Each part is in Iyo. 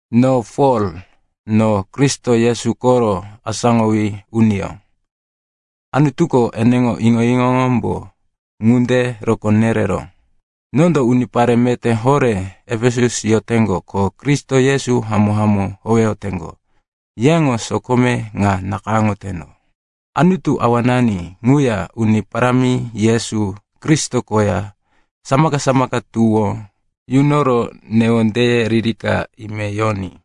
No Pol, no Kristo Yesu koro asáŋowí uniyó. Anutuko eneŋo iŋo-iŋoyómbo ŋunde rokó nereró. Nondo unipare meté horé Efesus yoteŋgo ko Kristo Yesu hamó-hamó howeyoteŋgo, yeŋo sokome ŋa nakayáŋoteno. Anutu Awanani, ŋuya Uni Parámi Yesu Kristo koya, samaka-samaka tuwó yunoro newondeye ririka ime yoní.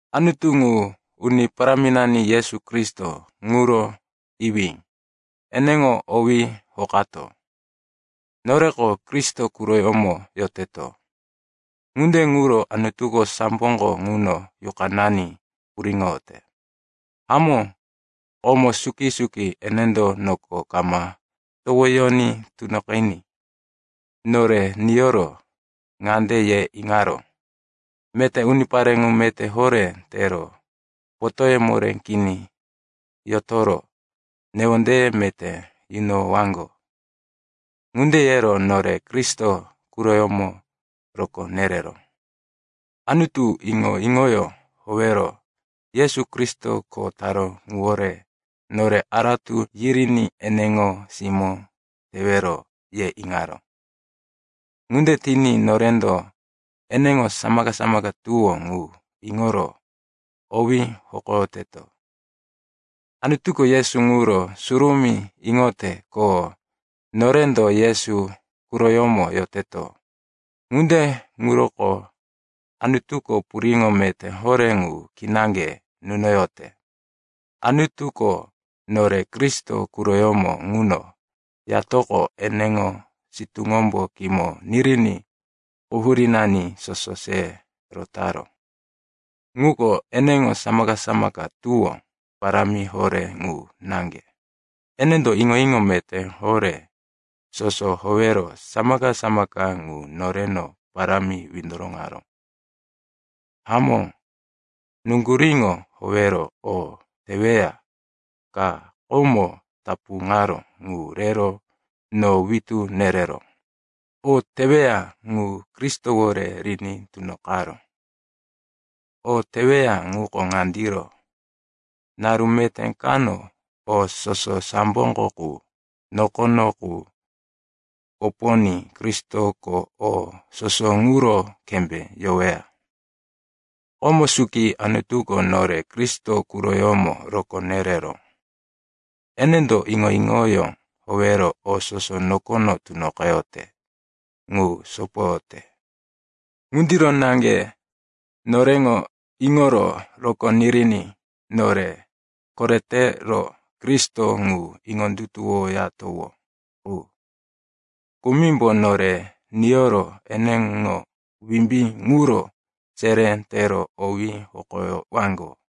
Anutu ŋu, Uni Paráminani Yesu Kristo ŋuro iwí, eneŋo owí hokato. Noreko Kristo quroyómo yoteto. Ŋunde ŋuro Anutuko samboko ŋuno yuqanani puriŋoyote. Hamó, komo suki-suki, enendo noko kama towoyoní tunoqiní, nore niyoro ŋande ye iŋaró, meté unipare ŋu meté horé tero, potóye moré kini yotoro, newondeye meté yunoyowaŋgo. Ŋunde yero nore Kristo quroyómo rokó nereró. Anutuko iŋo-iŋoyó howero, Yesu Kristo kho taró ŋuwore nore aratu yiriní ene simó tewero, ye iŋaró. Ŋunde tiní norendo eneŋo samaka-samaka tuwó ŋu iŋoro owí hokoyoteto. Anutuko Yesu ŋuro surumí iŋoyote, ko norendo Yesu quroyómo yoteto. Ŋunde ŋuroko Anutuko puriŋo meté horé ŋu kinaŋge nunoyote. Anutuko nore Kristo quroyómo ŋuno yatoqo, eneŋo sitúŋombo kimo niriní quhurínani soso se rotaró. Ŋuko eneŋo samaka-samaka tuwó parámi horé ŋu naŋge. Enendo iŋo-iŋo meté horé soso howero samaka-samaka ŋu noreno parámi windoroŋaró. Hamó, nuŋguríŋo howero o teweya ka komo tapuŋaró ŋu rero no witú nereró. O teweya ŋu Kristowore riní tunoqaró. O teweya ŋuko ŋandiro. Naru meté kano o soso samboko qu, nokono qu koponí Kristoko o soso ŋuro kembé yoweya. Komo suki Anutuko nore Kristo quroyómo rokó nereró. Enendo iŋo-iŋoyó howero o soso nokono tunoqeyote ŋu sopoyote. Ŋundiro naŋge noreŋo iŋoro rokó niriní nore koretero Kristo ŋu iŋondutuwoyatowó qu, kumimbo nore niyoro eneŋo wimbí ŋuro seré tero owí hokoyowaŋgo.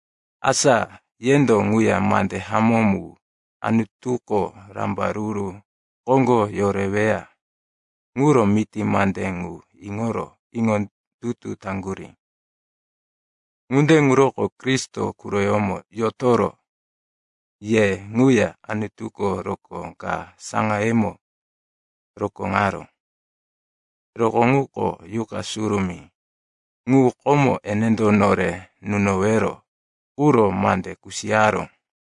Asa yendo ŋuya mande hamó mu, Anutuko rambaruru koŋgo yoreweya ŋuro miti mande ŋu, iŋoro iŋondutu taŋgurí. Ŋunde ŋuroko Kristo quroyómo yotoro ye ŋuya Anutuko rokó ka saŋayemo rokóŋaró. Rokó ŋuko Yuqa Surumí ŋu, komo enendo nore nunowero quro mande kusiyaró.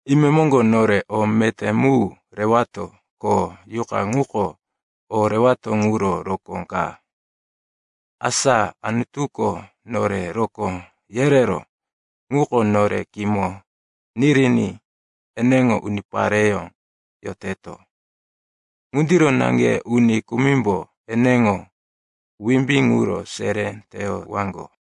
Imemoŋgo nore o meté mu rewato, ko Yuqa ŋuko o rewato ŋuro rokó ka. Asa Anutuko nore rokó yereró ŋuko nore kimo niriní eneŋo unipareyó yoteto. Ŋundiro naŋge uni kumimbo eneŋo wimbí ŋuro seré teyowaŋgo.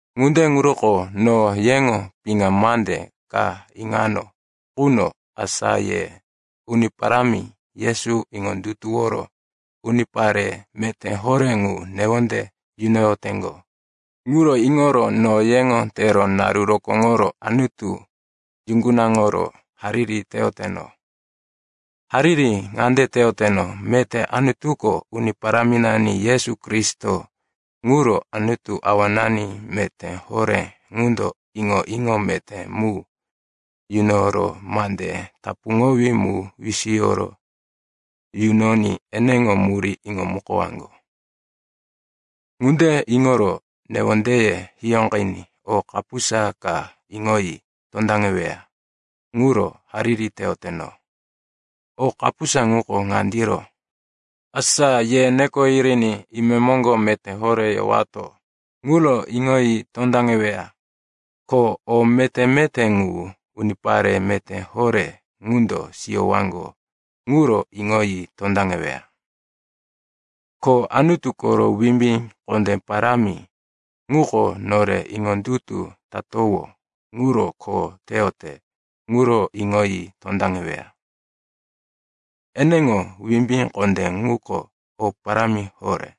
Ŋunde ŋuroko no yeŋo piŋa mande ka iŋano quno, asa ye Uni Parámi Yesu iŋondutuworo unipare meté horé ŋu newonde yunoyoteŋgo ŋuro iŋoro no yeŋo tero naru rokóŋoro Anutu yuŋgunaŋoro hariri teyoteno. Hariri ŋande teyoteno, meté Anutuko, Uni Paráminani Yesu Kristo ŋuro Anutu, Awanani meté horé ŋundo iŋo-iŋo meté mu yunoro mande tapuŋowí mu wisiyo yunoní eneŋo murí iŋomukowaŋgo. Ŋunde iŋoro newondeye hiyóqiní o kapusa ka iŋoyi tondaŋeweya ŋuro hariri teyoteno. O kapusa ŋuko ŋandiro, asa ye neko yiriní imemoŋgo meté horé yowato ŋuro iŋoyi tondaŋeweya, ko o meté-meté ŋu unipare meté horé ŋundo siyowaŋgo ŋuro iŋoyi tondaŋeweya, ko Anutu koro wimbí kondé parámi ŋuko nore iŋondutu tatowó ŋuro kho teyote ŋuro iŋoyi tondaŋeweya. Eneŋo wimbí kondé ŋuko o parámi horé.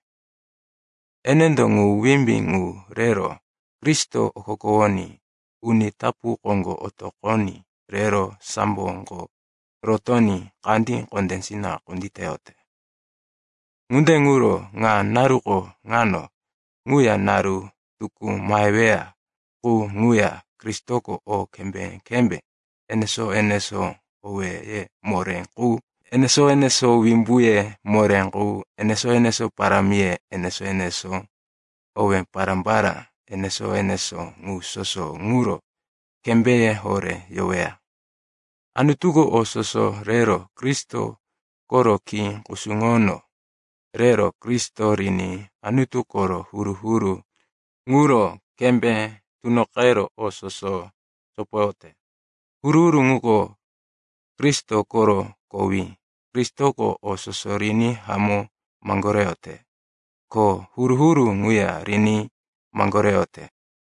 Enendo ŋu wimbí ŋu rero Kristo okokowoní uni tapu koŋgo otoqoní rero samboko rotoní kandí kondésina kunditeyote. Ŋunde ŋuro ŋa naruko ŋano ŋuya naru tukú maheweya qu ŋuya Kristoko o kembé-kembé enesó-enesó, owéye moré qu enesó-enesó, wimbuye moré qu enesó-enesó, parámiye enesó-enesó, owé pará-pará enesó-enesó, ŋu soso ŋuro kembéye horé yoweya. Anutuko o soso rero Kristo koro khí kusuŋono rero Kristo riní Anutu koro huru-huru ŋuro kembé tunoqero o soso sopoyote. Huru-huru ŋuko Kristo koro kowí. Kristoko o soso riní hamó maŋgoreyote, ko huru-huru ŋuya riní maŋgoreyote.